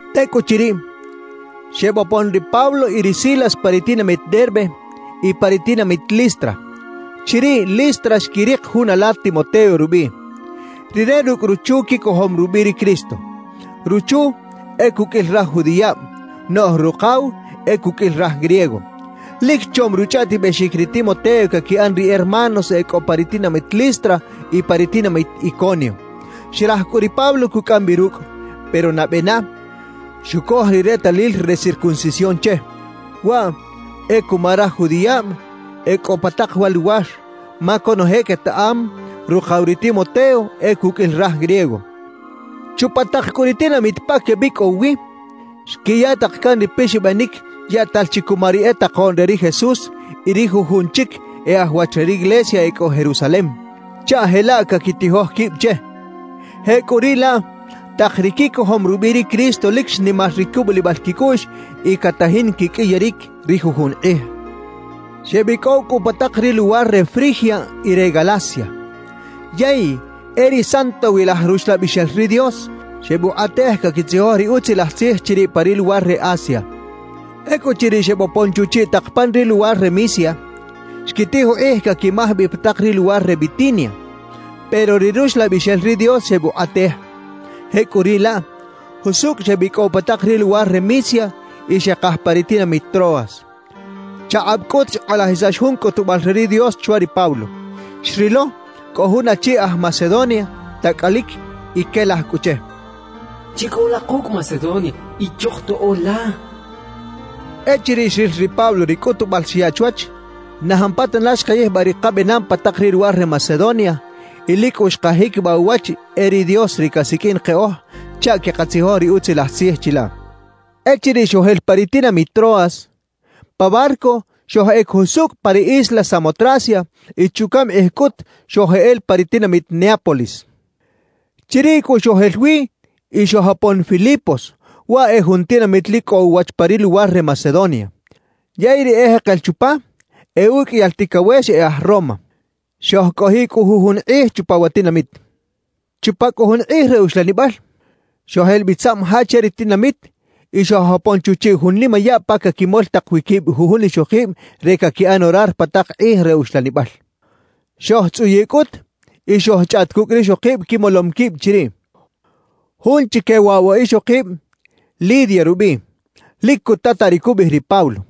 Tecꞌuchiriꞌ, xebopon ri Pablo y ri Silas pa ri tinamit Derbe y pa ri tinamit Listra. Chiriꞌ Listra xquirik jun ala Timoteo rubiꞌ. Rire rucꞌ ruchu quicojom rubiꞌ ri Cristo. Ruchu e cuqꞌuil raj judiꞌab, noꞌj rukaw e cuqꞌuil raj griego. Lic chom ruchꞌaꞌtibexic ri Timoteo caquiꞌan ri hermanos e cꞌo pa ri tinamit Listra y pa ri tinamit Iconio. Xraj cꞌu ri Pablo cucꞌam bi rucꞌ; pero nabe na, xucoj ri retalil re circuncisión che. Waꞌ e cuma raj judiꞌab e cꞌo pa tak wa luwar, ma conoje quetaꞌam rukaw ri Timoteo e cuqꞌuil raj griego. Chupa tak cꞌu ri tinamit pa quebicꞌow wi, xquiya tak can ri pixabanic yaꞌtal chi cuma ri e takoꞌn re ri Jesús y ri jujun chic e aj wach re riglesia e cꞌo Jerusalem, chaꞌ jelaꞌ caquitijoj quib che. Jecꞌuriꞌlaꞌ tak ri quicojom rubiꞌ ri Cristo lic xnimar ri cubulibal quicꞌuꞌx y catajin quiqꞌuiyaric ri jujun kꞌij. Xebicꞌow cꞌu pa tak ri luwar re Frigia y re Galacia, yey e ri Santowilaj Ruxlabixel ri Dios xebukꞌatej caquitzijoj ri Utzilaj Tzij chiriꞌ pa ri luwar re Asia. Ecꞌuchiriꞌ xebopon chuchiꞌ tak pan ri luwar re Misia, xquitij ukꞌij caquimaj bi pa tak ri luwar re Bitinia, pero ri Ruxlabixel ri Dios xebukꞌatej. Jecꞌuriꞌlaꞌ, jusucꞌ xebicꞌow pa tak ri luwar re Misia y xekaj pa ri tinamit Troas. Chakꞌab cꞌut xkꞌalajisax jun cꞌutubal re ri Dios chwa ri Pablo. Xrilo cꞌo jun achi aj Macedonia, tacꞌalic y quelaj cꞌu che: «Chicꞌow la kucꞌ Macedonia y chojtoꞌo la» cachaꞌ. Echiriꞌ xril ri Pablo ri cꞌutubal xyaꞌ chwach, na jampatana xkayijbaꞌ ri kabenam pa tak ri luwar re Macedonia y lic cꞌu xkajiquibaꞌ uwach e ri Dios ri casiqꞌuin keꞌoj chaꞌ queꞌkatzijoj ri Utzilaj Tzij chilaꞌ. Echiriꞌ xojel pa ri tinamit Troas, pa barco xojꞌec jusucꞌ pa ri isla Samotracia y chucaꞌm kꞌij cꞌut xojeꞌela pa ri tinamit Neápolis. Chiriꞌ cꞌu xojel wi y xojopon Filipos, waꞌ e jun tinamit lic cꞌo uwach pa ri luwar re Macedonia; yey ri ejekel chupa e uqꞌuiyal ticawex e aj Roma. Xojcꞌojiꞌ cꞌu jujun kꞌij chupa wa tinamit. Chupa cꞌu jun kꞌij re uxlanibal, xojel bi tzaꞌm ja che ri tinamit y xojopon chuchiꞌ jun nimayaꞌ pa caquimol tak wi quib jujun ixokib re caquiꞌan orar pa tak kꞌij re uxlanibal. Xojtzꞌuyiꞌ cꞌut y xojchꞌaꞌt cucꞌ rixokib quimolom quib chiriꞌ. Jun chique waꞌ wa ixokib, Lidia rubiꞌ, lic cutataꞌ ri cubiꞌij ri Pablo.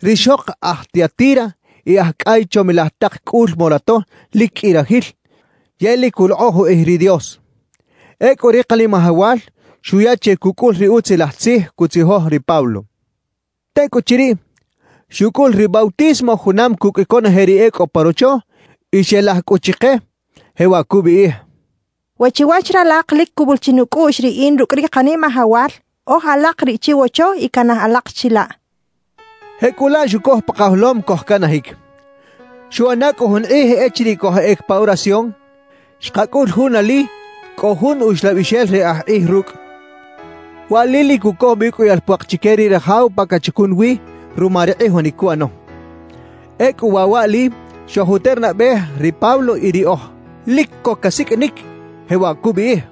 Rixok aj Tiatira y aj cꞌay chomilaj tak cꞌul morato lic qꞌui rajil yey lic culokꞌoj ukꞌij ri Dios. Ecꞌu ri Kanimajawal xuya che cucꞌul ri Utzilaj Tzij cutzijoj ri Pablo. Tecꞌuchiriꞌ, xucꞌul ri bautismo junam cucꞌ conoje ri e cꞌo pa rocho, y xelaj cꞌu chike, jewaꞌ cubiꞌij: —We chiwach ralak lic cubul chi nucꞌuꞌx riꞌin rucꞌ ri Kanimajawal, oj alak riꞌ chiwocho y canaj alak chilaꞌ —cachaꞌ. Jecꞌulaꞌ xucoj pa kajolom cojcanajic. Xuꞌana cꞌu jun kꞌij echiriꞌ cojꞌec pa oración, xkacꞌul jun ali cꞌo jun uxlabixel re aj kꞌij rucꞌ. Wa ali lic cucoj bi uqꞌuiyal puak chique ri rajaw pa cachacun wi ruma ri kꞌijonic cuꞌano. Ecꞌu waꞌ waꞌli xojuternabej ri Pablo y riꞌoj, lic co casiqꞌuinic, jewaꞌ cubiꞌij: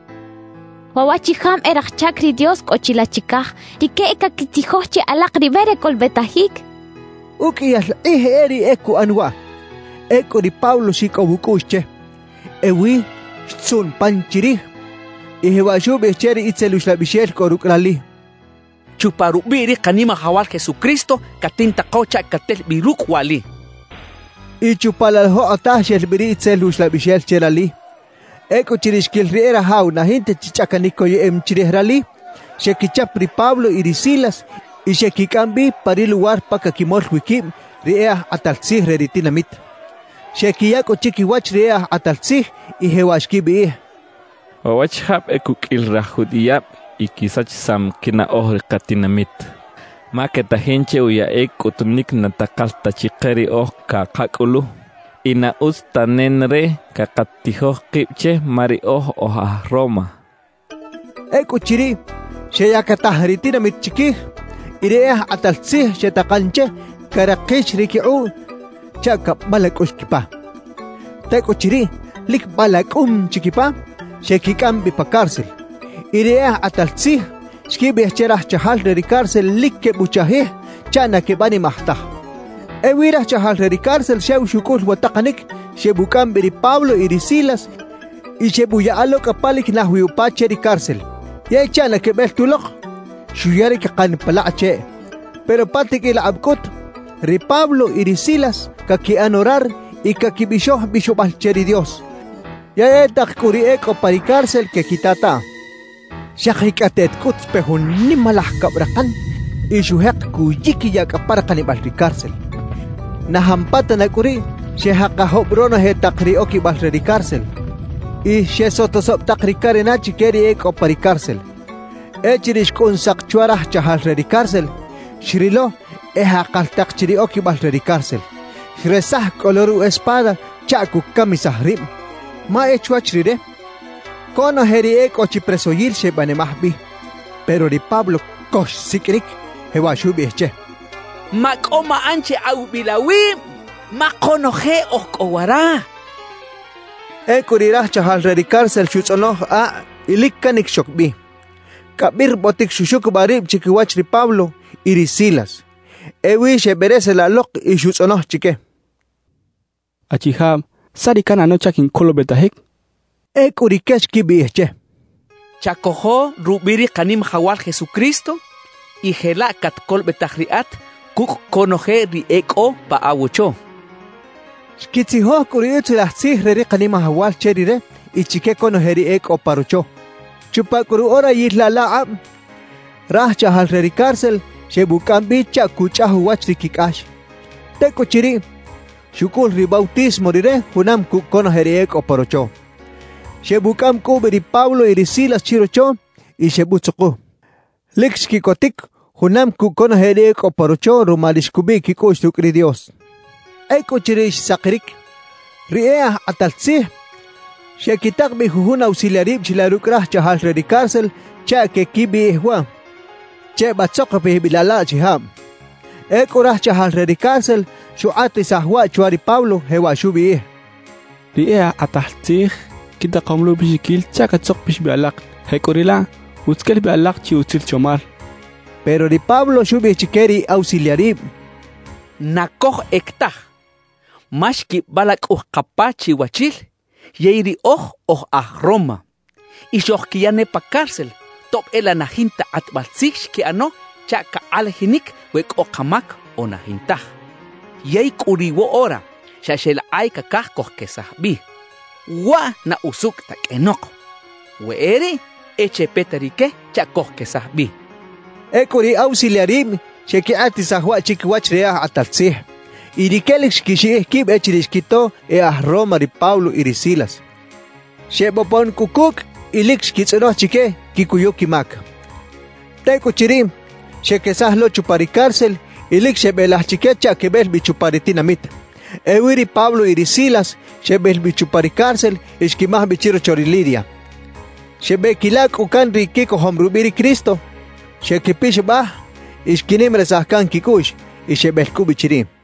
—Waꞌ waꞌchijab e raj chac ri Dios cꞌo chilaꞌ chicaj; rique e caquitzijoj che alak ri be re colobetajic —cachaꞌ. Uqꞌuiyal kꞌij e riꞌ e cuꞌan waꞌ. Ecꞌu ri Pablo xicꞌow ucꞌuꞌx che. Ewi xtzuꞌn pan chirij y jewaꞌ xubiꞌij che ri itzel uxlabixel cꞌo rucꞌ rali: —Chupa rubiꞌ ri Kanimajawal Jesucristo catintako chaꞌ catel bi rucꞌ waꞌli —xchaꞌ. Y chupa laꞌ la jokꞌotaj xel bi ri itzel uxlabixel che rali. Ecꞌuchiriꞌ xquil ri e rajaw na jinta chi chꞌacanic coyeꞌem chirij rali, xequichap ri Pablo y ri Silas y xequicꞌam bi pa ri luwar pa caquimol wi quib ri e aj kꞌatal tzij re ri tinamit. Xequiya cꞌu chiquiwach ri e aj kꞌatal tzij y jewaꞌ xquibiꞌij: —Waꞌ waꞌchijab e cuqꞌuil raj judiꞌab y quisachisam quinaꞌoj ri katinamit. Ma quetajin che uyaꞌic cꞌutunic na takal ta chike riꞌoj cakacꞌulu, y na utz ta nenareꞌ cakatijoj kib che, ma riꞌoj oj aj Roma —xechaꞌ. Ecꞌuchiriꞌ, xeyactaj ri tinamit chiquij; y ri e aj kꞌatal tzij xetakan che carakix ri quikꞌuꞌ chaꞌ cabalacꞌux quipa. Tecꞌuchiriꞌ lic balacꞌum chi quipa, xequicꞌam bi pa cárcel. Y ri e aj kꞌatal tzij xquibiꞌij che raj chajal re ri cárcel lic quebuchajij chaꞌ na quebanimaj taj. Ewi raj chajal re ri cárcel xew xucꞌul wa takanic, xebucꞌam bi ri Pablo y ri Silas y xebuyaꞌa lo cꞌa pa lic naj wi upa che ri cárcel. Yey chaꞌ na quebel tulok, xuya ri cakan pa lakꞌ cheꞌ. Pero pa tiqꞌuil akꞌab cꞌut, ri Pablo y ri Silas caquiꞌan orar y caquibixoj bixobal che ri Dios. Yey e tak cꞌu ri e cꞌo pa ri cárcel quequitataꞌ. Xakicꞌateꞌt cꞌut xpe jun nimalaj cabrakan y xujek cuyiquiyaꞌ cꞌa pa rakanibal ri cárcel. Na jampatana cꞌu riꞌ xejakajob ronoje tak ri oquibal re ri cárcel y xesotosob tak ri carena chique ri e cꞌo pa ri cárcel. Echiriꞌ xcꞌun sak chwa raj chajal re ri cárcel, xrilo e jakal tak chi ri oquibal re ri cárcel. Xresaj cꞌu lo ru espada chaꞌ cucamisaj rib; ma e chwach rire, conoje ri e cꞌo chi presoyil xebanimaj bi. Pero ri Pablo co xsiqꞌuinic, jewaꞌ xubiꞌij che: —¡Macꞌo maꞌan che awibil awib, ma konoje oj cꞌo wara! —xchaꞌ. Ecꞌu riꞌ raj chajal re ri cárcel xutzꞌonoj akꞌ y lic canic xoc bi. Cabirbotic xuxucubaꞌ rib chiquiwach ri Pablo y ri Silas. Ewi xebereselaꞌ lok y xutzꞌonoj chique: —Achijab, ¿saꞌ ri canꞌano chaꞌ quincolobetajic? —xchaꞌ. Ecꞌu rique xquibiꞌij che: —Chacojo rubiꞌ ri Kanimajawal Jesucristo y jelaꞌ catcolobetaj riꞌat cucꞌ conoje ri e cꞌo pa wocho —xechaꞌ. Xquitzijoj cꞌu ri Utzilaj Tzij re ri Kanimajawal che rire y chique conoje ri e cꞌo pa rocho. Chupa cꞌu ru orayil laꞌ la akꞌab, raj chajal re ri cárcel xebucꞌam bi chaꞌ cuchꞌaj uwach ri quicꞌax. Tecꞌuchiriꞌ, xucꞌul ri bautismo rire junam cucꞌ conoje ri e cꞌo pa rocho. Xebucꞌam cꞌu bi ri Pablo y ri Silas chirocho y xebutzuku. Lic xquiꞌcotic junam cucꞌ conoje ri e cꞌo pa rocho ruma ri xcꞌubiꞌ quicꞌuꞌx rucꞌ ri Dios. Ecꞌuchiriꞌ xsakiric, ri e aj kꞌatal tzij xequitak bi jujun ausiliarib chilaꞌ rucꞌ raj chajal re ri cárcel chaꞌ queꞌquibiꞌij waꞌ: «Chebatzokopij bi laꞌ la achijab.» Ecꞌu raj chajal re ri cárcel xukꞌatisaj waꞌ chwa ri Pablo, jewaꞌ xubiꞌij: —Ri e aj kꞌatal tzij quitakom lo ubiꞌxiquil chaꞌ catzokpix bi alak; jecꞌuriꞌlaꞌ utz quel bi alak chi utzil chomal —xcha chique. Pero ri Pablo xubiꞌij chique ri ausiliarib: —¡Na cojꞌec taj! Ma xquibalacꞌuj kapa chiwachil, yey riꞌoj oj aj Roma. Y xojquiya ne pa cárcel, tob e laꞌ na jinta kꞌatbal tzij xquiꞌano chaꞌ cakꞌalajinic we cꞌo kamac o na jintaj. Yey cꞌu riꞌ woꞌora, xa xeꞌlakꞌay cacaj cojquesaj bi. ¡Waꞌ na usucꞌ ta qꞌuenok! We e riꞌ, e chepeta rique chaꞌ cojquesaj bi —xchaꞌ. Ecꞌu ri ausiliarib xeꞌquikꞌatisaj waꞌ chiquiwach ri e aj kꞌatal tzij, y rique lic xquixiꞌij quib echiriꞌ xquito e aj Roma ri Pablo y ri Silas. Xebopon cꞌu cucꞌ y lic xquitzꞌonoj chique quicuyu quimac. Tecꞌuchiriꞌ, xequesaj lo chupa ri cárcel y lic xebelaj chique chaꞌ quebel bi chupa ri tinamit. Ewi ri Pablo y ri Silas xebel bi chupa ri cárcel y xquimaj bi chirocho ri Lidia. Xebeꞌquila cꞌu can ri quicojom rubiꞌ ri Cristo, xequipixabaj y xquinimarisaj can quicꞌuꞌx. Y xebel cꞌu bi chiriꞌ.